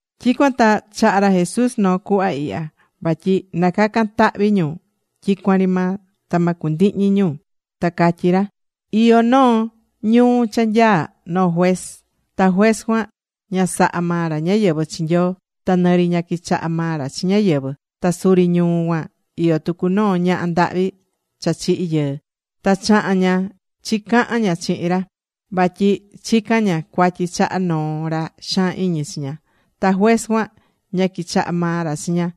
Tyicuan ta chaha̱ ra Jesús noo cuhva ihya. Vatyi na cacan tahvi ñu tyicuan ri maa, ta ma cundihñi ñu. Ta catyí ra: ―Iyó noo ñuu cha nyaá noo juez. Ta juez cuan ña sahá maa ra ñáyɨvɨ chi Nyoo. Ta nɨ ri ña quichaha maa ra chi ñáyɨvɨ. Ta suri ñuu cuan iyó tucu noo ñaha ndahvi cha chihi̱ yɨɨ. Ta chaha̱n ña chicahan ña chihin ra, vatyi chicá ña cuatyi chaha noo ra xaan iñi chi ña. Ta juez cuan ña quichaha̱ maa ra chi ña.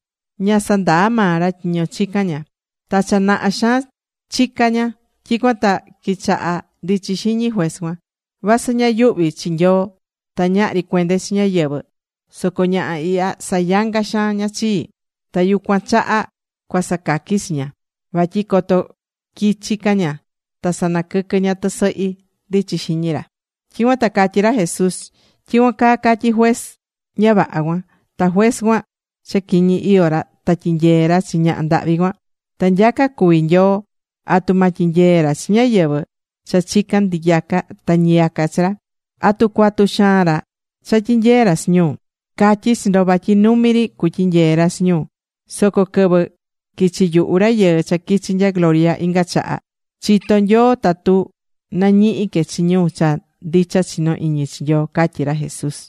Ña sandaa̱ maa ra tyiño chicá ña. Ta cha naha xaan chicán ña. Tyicuan ta quichaha ndichi xiñi juez cuan: “Vasɨ ña yuhví chi Nyoo, ta ñahri cuende chi ñáyɨvɨ, soco ñaha ihya sayangá xaan ña chii. Ta yucuan chaha cua sacaqui chi ña. Vatyi coto quichi ca ña, ta sanaquɨquɨ ña tɨsɨhi”, ndichi xiñi ra. Tyicuan ta catyí ra Jesús: ―Tyicuan caa catyi̱ juez ña vaha cuan. Tu juez cuan cha quiñi iyó ra ta tyinyee̱ ra chi ñaha ndahvi cuan, ta nyaca cuví Nyoo, ¿atu ma tyinyee ra chi ñáyɨvɨ cha chicán ndiyaca ta ndɨquɨvɨ chi ra? ¿Atu cuatu xaan ra cha tyinyee ra chi ñu? Catyí chi ndo, vatyi numi ri cutyinyee ra chi ñu. Soco quɨvɨ quichi yuhu, Rayɨɨ cha quichi̱ nya gloria, inga chaha, chitó Nyoo tatu nañihi que chi ñu cha ndicha chinó iñi chii ―catyí ra Jesús.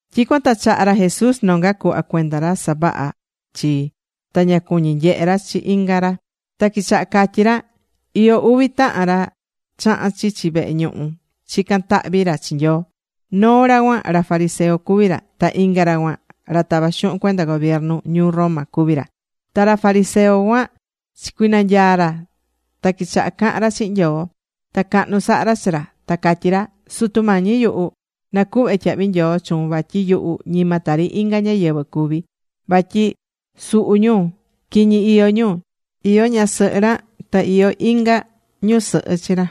Tyicuan ta chaha̱ ra Jesús nonga cuhva cuenda ra savahá chii, ta ña cuñí nyehe ra chi inga ra. Ta quichaha catyí ra: ―Iyó uvi tahan ra chaha̱n chichi vehe ñuhu chicaca̱n tahvi ra chi Nyoo. Noo ra cuan ra fariseo cuví ra. Ta inga ra cuan ra tavá xuhun cuenda gobiernu ñuu Roma cuví ra. Ta ra fariseo cuan chicuinanyaa ra, ta quichaha cahan ra chihin Nyoo. Ta cahnu saha ra chi ra. Ta catyí ra: “Sutu Mañi yuhu, nacuhve tyahvi nyoo chuun vatyi yuhu ñima tari inga ñáyɨvɨ cuví. Vatyi suhu ñu. Quiñi iyó ñu. Iyó ñasɨhɨ ra ta iyó inga ñusɨhɨ chi ra.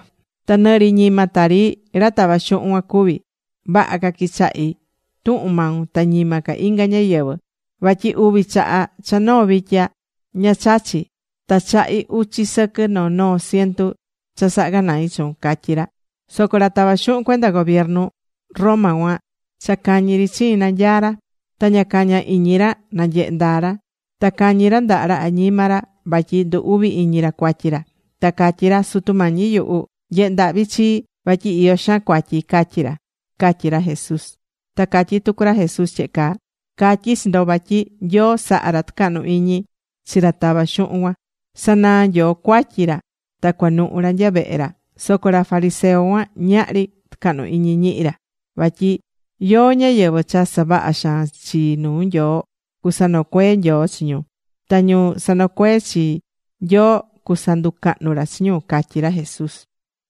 Ta nɨ ri ñima tari ra tavá xuhun cuan cuví. Vaha ca quichahí tuhun maun ta ñima ca inga ñáyɨvɨ. Vatyi uvi chaha cha noo vitya ña chachí. Ta chahí uchi sɨquɨ noo noo cientu cha sahá ganai chuun”, catyí ra. Soco ra tavá xuhun cuenda gobiernu Roma cuan cha cañi ri chiin nanyaá ra. Ta ña caña iñi ra nanyehe ndaa ra. Ta cañí ra ndaha ra añima ra vatyi ndu uvi iñi ra cuatyi ra. Ta catyí ra: “Sutu Mañi yuhu. Nye̱he ndahvi chii vatyi iyó xaan cuatyi”, catyí ra ―catyí ra Jesús. Ta catyí tucu ra Jesús tyehe caa: ―Catyí chi ndo vatyi Nyoo sahá ra tucahnu iñi chi ra tavá xuhun cuan. Sanaa̱ Nyoo cuatyi ra ta cuanuhu ra nya vehe ra. Soco ra fariseo cuan, ñahri tucahnu iñi ñihi ra, vatyi yóó ñáyɨvɨ cha savahá xaan chi nuu Nyoo, cusanocuee Nyoo chi ñu, ta ñu sanocuee chi, Nyoo cusanducahnu ra chi ñu ―catyí ra Jesús.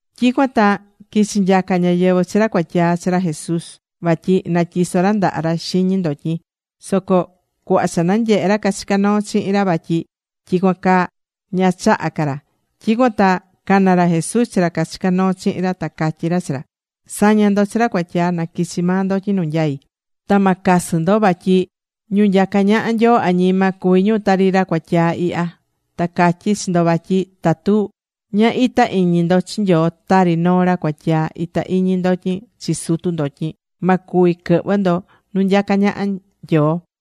Tyicuan ta quichi nyaca ñáyɨvɨ chi ra cuatyaa chi ra Jesús vatyi na tyiso ra ndaha ra xiñi ndotyin. Soco cuhva cha nanyehe̱ ra cachicá noo chihin ra vatyi tyicuan caa, ña chaha̱ ca ra. Tyicuan ta cana̱ ra Jesús chi ra cachicá noo chihin ra, ta catyí ra chi ra: ―Sa̱ña ndo chi ra cuatyaa na quichi maa ndotyin nu nyai. Ta ma casɨ ndo, vatyi ñu nyacá ñaha Nyoo añima, cuví ñu tari ra cuatyaa ihya. Ta catyí chi ndo vatyi tatu ña ita iñi ndo chi Nyoo, tari noo ra cuatyaa ita iñi ndotyin chi sutu ndotyin, ma cuvi quɨhvɨ ndo nu nyacá ñaha Nyoo.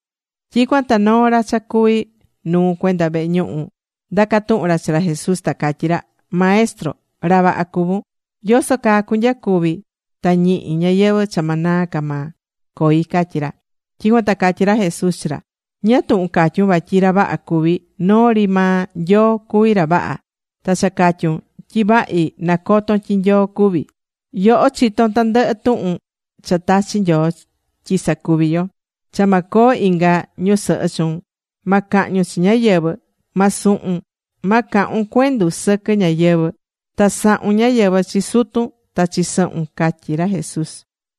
Tyicuan ta noo ra cha cuví nuu cuenda vehe ñuhu ndacá tuhun ra chi ra Jesús, ta catyí ra: ―Maestro, ra vaha cuvún. ¿Yoso caa cunyacuvi ta ñihi ñayɨvɨ̱ cha ma naa ca maa coi? ―catyí ra. Tyicuan ta catyí ra Jesús chi ra: ―¿Ñáá tuhun catyún vatyi ra vaha cuví? Noo ri maa Nyoo cuví ra ra vaha. (Ta cha catyún tyi vahi, nacotón tyi Nyoo cuví.) Yoho chitón tandɨhɨ tuhun cha tachi̱ Nyoo tyi sacuvi yo: “Cha ma coo inga ñusɨhɨ chuun. Ma cahñun chi ñáyɨvɨ. Ma suhun. Ma cahun cuendu sɨquɨ ñáyɨvɨ. Ta sa̱hun ñáyɨvɨ chi sutun ta chi sɨhun” ―catyí ra Jesús.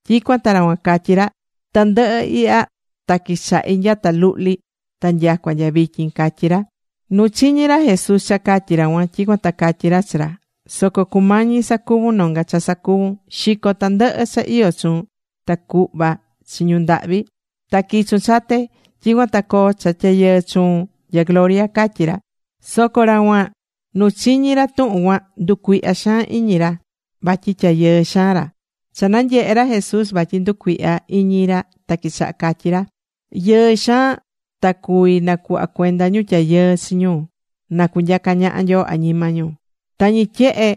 Tyicuan ta ra cuan catyí ra: ―Tandɨhɨ ihya ta quichahí nyata luhli ta nyacua nya vityin ―catyí ra. Nu chiñi̱ ra Jesús cha catyí ra cuan, tyicuan ta catyí ra chi ra: ―Soco cumañi sacuvun nonga cha sacuvun. Xi̱co tandɨhɨ cha iyó chuun. Ta cu̱hva chi ñu ndahvi. Ta qui̱chun chate. Tyicuan ta coo cha tyayɨɨ chuun nya gloria ―catyí ra. Soco ra cuan nu chiñi̱ ra tuhun cuan, nducuihya xaan iñi ra, vatyi tyayɨɨ xaan ra. Cha nanyehe̱ ra Jesús vatyi nducuihya iñi ra, ta quichaha catyi ra: ―Yɨɨ xaan ta cuvi nacuhva cuenda ñu tyayɨɨ chi ñu na cunyaca ñaha Nyoo añima ñu. Tañi tyehe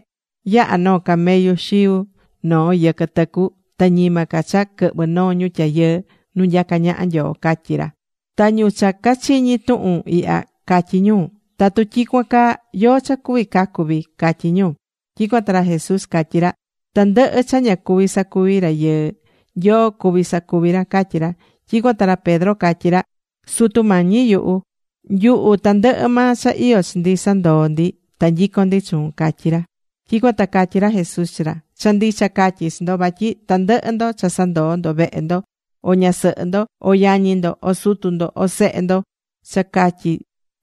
yaha noo camello xiu noo yɨquɨ tɨcu, ta ñima ca cha quɨhvɨ noo ñu tyayɨɨ nu nyacá ñaha Nyoo ―catyí ra. Ta ñu cha cachiñi̱ tuhun ihya catyí ñu: ―Tatu tyicuan caa, ¿yóó cha cuví cacu vii? ―catyí ñu. Tyicuan ta ra Jesús catyí ra: ―Tandɨhɨ cha ña cuví sacuvi rayɨɨ, Nyoo cuví sacuvi ra ―catyí ra. Tyicuan ta ra Pedro catyí ra: ―Sutu Mañi yuhu, nyuhu tandɨhɨ maa cha iyó chi ndi sandoo̱ ndi, ta nyicón ndi chuun ―catyí ra. Tyicuan ta catyí ra Jesús chi ra: ―Cha ndicha catyí chi ndo. Vatyi tandɨhɨ ndo cha sandoo ndo vehe ndo, o ñasɨhɨ ndo, o yañi ndo, o sutu ndo, o sehe ndo cha catyi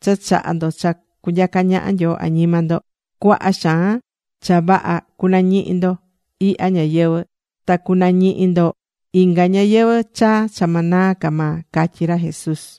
cha chaha̱ ndo cha cunyaca ñaha Nyoo añima ndo, cuaha xaan cha vaha cunañihi ndo ihya ñayɨvɨ̱ ta cunañihi ndo inga ñayɨvɨ̱ cha ma naa ca maa ―catyí ra Jesús.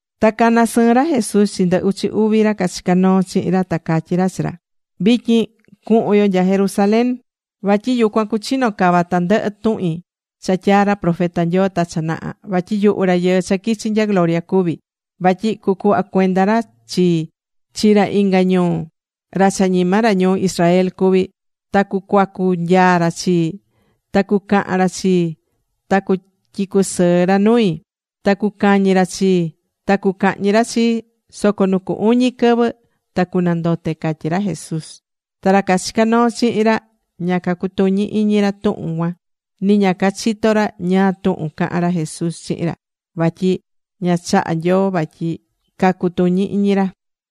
Ta cana̱ sɨɨn ra Jesús chi ndɨ uchi uvi ra cachicá noo chihin ra, ta catyí ra chi ra: ―Vityin cuhun yo nya Jerusalén. Vatyi yucuan cuchino cava tandɨhɨ tuhin cha tyaa̱ ra profeta Nyoo ta cha naha. Vatyi yuhu Rayɨɨ cha quichi̱ nya gloria cuví. Vatyi cucuhva cuenda ra chii chi ra inga ñuu, ra cha ñima ra ñuu Israel cuví. Ta cucuacu nyaa ra chii. Ta cucahan ra chii. Ta cutyicusɨɨ ra nui. Ta cucañi ra chii, ta cucahñi ra chii, soco nu cu uñi quɨvɨ ta cunandote ―catyí ra Jesús. Ta ra cachicá noo chihin ra ña cutuñi iñi ra tuhun cuan ni ña cachitó ra ñáá tuhun cahán ra Jesús chihin ra. Vatyi ña chaha̱ Nyoo vatyi cacutuñi iñi ra.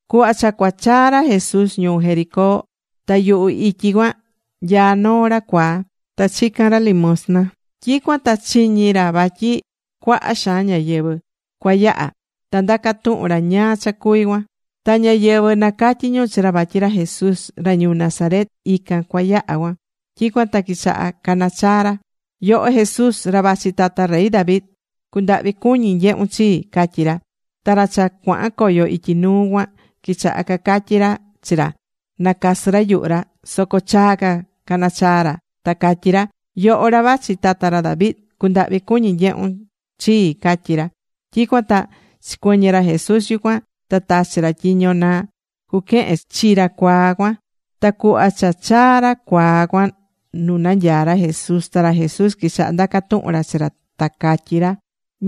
Cuhva cha cua chaa ra Jesús ñuu Jericó. Ta yuhu ityi cuan nyaá noo ra cuaa. Ta chicán ra limuxtan. Tyicuan ta chiñi̱ ra vatyi cuaha xaan ñáyɨvɨ cua yaha. Ta ndaca̱ tuhun ra ñáá cha cuví cuan. Ta ñáyɨvɨ nacatyí ñu chi ra vatyi ra Jesús, ra ñuu Nazaret, ican cua yaha cuan. Tyicuan ta quichaha cana chaa ra: ―¡Yoho Jesús, ra vachi tata rey David! ¡Cu̱ndahvi cuñi nyehun chii! ―catyí ra. Ta ra cha cuahan coyo ityi nuu cuan, quichaha cacatyi ra chi ra, nacasɨ ra yuhu ra. Soco chaa ca caná chaa ra, ta catyí ra: ―¡Yoho, ra vachi tata ra David! ¡Cu̱ndahvi cu̱ñi nyehun chii! ―catyí ra. Tyicuan ta chicuɨñɨ ra Jesús yucuan. Ta tachi̱ ra tyiño na cuquehen chi ra cuaa cuan. Ta cuhva cha chaa̱ ra cuaa cuan nu nanyaá ra Jesús, ta ra Jesús quichaha ndaca tuhun ra chi ra, ta catyí ra: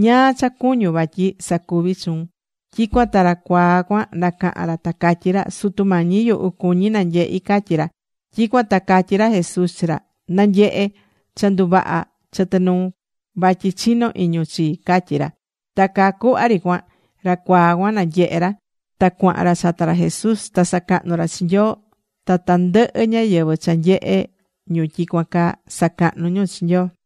―¿Ñáá cha cuñún vatyi sacuvi chuun? Tyicuan ta ra cuaa cuan nacahan ra, ta catyí ra: ―Sutu Mañi yuhu, cuñí nanyehi ―catyí ra. Tyicuan ta catyí ra Jesús chi ra: ―Na̱nyehe. Cha nduvaha̱ chɨtɨ nuun, vatyi chinó iñun chii ―catyí ra. Ta caa cuhva ri cuan, ra cuaa cuan nanyehe̱ ra. Ta cuahan ra chata ra Jesús. Ta sacahnú ra chi Nyoo. Ta tandɨhɨ ñáyɨvɨ cha nyehe ñu tyicuan caa, sacahnú ñu chi Nyoo.